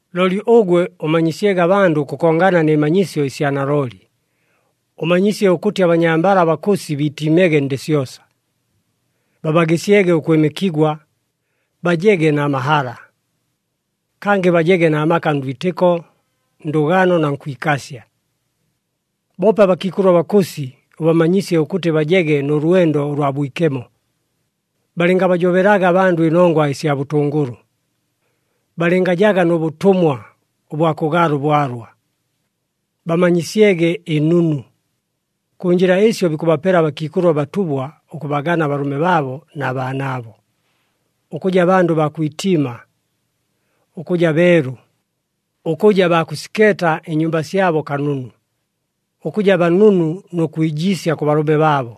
Looli ʉgwe ʉmanyisyege abandʉ ʉkʉkongana nɨ manyisyo ɨsya nalooli. Ʉmanyisye ʉkʉtɨ abanyambala abakʉsi biitiimege ndɨ syosa, babagɨsyege ʉkwɨmɨkigwa, bajege na mahala. Kangɨ bajege na maka ndwitɨko, ndʉgano na nkwikasya. Boope abakiikʉlʉ abakʉsi ʉbamanyisye ʉkʉtɨ bajege nʉ lwendo ʉlwa bwikemo, balɨngabajobelaga abandʉ ɨnongwa ɨsya bʉtʉngʉlʉ, balɨngajaga nʉ bʉtʉmwa ʉbwa kʉgaala ʉbwalwa. Bamanyisyege ɨnunu. Kʉ njɨla ɨsyo bikʉbapela abakiikʉlʉ abatubwa ʉkʉbagana abalʉme baabo na baanaabo, ʉkʉja bandʉ baa kwitiima, ʉkʉja beelu, ʉkʉja baa kʉsikeeta ɨnyumba syabo kanunu, ʉkʉja banunu nʉ kwijiisya kʉ balʉme baabo,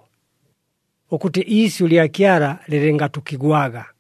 ʉkʉtɨ iisyʉ lya Kyala lɨlɨngatʉkigwaga.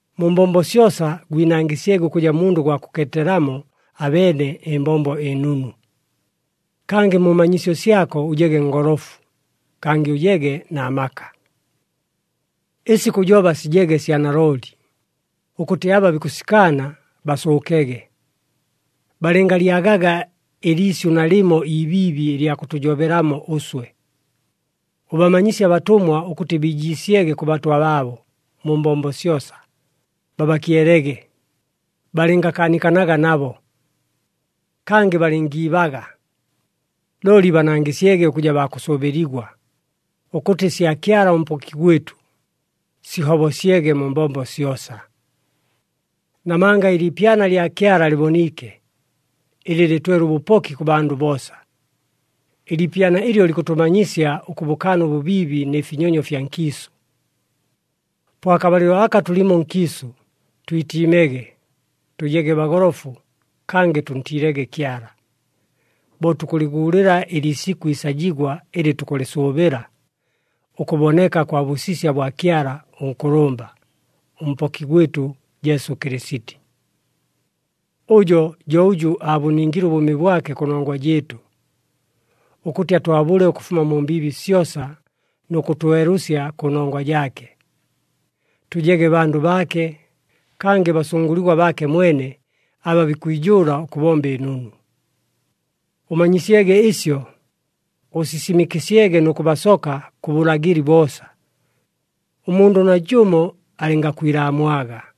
Mu mbombo syosa gwinangɨsyege ʉkʉja mundʉ gwa kʉkeetelamo abeene ɨmbombo ɨnunu. Kangɨ mu manyisyo syako ʉjege ngolofu, kangɨ ʉjege na maka. Ɨsi kʉjoba sijege sya nalooli, ʉkʉtɨ aba bikʉsikaana, basʉʉkege, balɨngalyagaga ɨliisyʉ nalɨmo ibiibi ɨlya kʉtʉjobelamo ʉswe. Ʉbamanyisye abatʉmwa ʉkʉtɨ biijiisyege kʉ batwa baabo mu mbombo syosa, babakyelege, balɨngakaanikanaga nabo. Kangɨ balɨngiibaga, looli banangɨsyege ʉkʉja baa kʉsʉʉbɨligwa, ʉkʉtɨ ɨsya Kyala ʉMpoki gwɨtʉ, sihobosyege mu mbombo syosa. Namanga ɨliipyana lya Kyala lɨboniike, ɨlɨ lɨtwele ʉbʉpoki kʉ bandʉ boosa. Ɨliipyana ɨlyo likʉtʉmanyisya ʉkʉbʉkaana ʉbʉbiibi nɨ finyonyo fya nkiisʉ. Po akabalɨlo aka tʉlimo nkiisʉ, twitiimege, tʉjege bagolofu, kangɨ tʉntiilege Kyala, bo tukʉlɨguulɨla ɨliisikʉ iisajigwa ɨlɨ tukʉlɨsʉʉbɨla, ʉkʉboneka kwa bʉsisya bwa Kyala ʉNkʉlʉmba, ʉMpoki gwɨtʉ, Jesu Kɨlɨsiti. Ʉjo jo ʉjʉ aabʉningile ʉbʉʉmi bwake kʉnongwa jɨɨtʉ, ʉkʉtɨ atwabʉle ʉkʉfuma mu mbiibi syosa nʉ kʉtwelʉsya kʉnongwa jaake, tʉjege bandʉ baake, kangɨ basʉngʉligwa baake mwene, aba bikwijʉʉla ʉkʉbomba ɨnunu. Ʉmanyisyege ɨsyo, ʉsisimɨkɨsyege nʉ kʉbasoka kʉ bʉlagɨli boosa, ʉmundʉ najʉmo alɨngakwilaamwaga.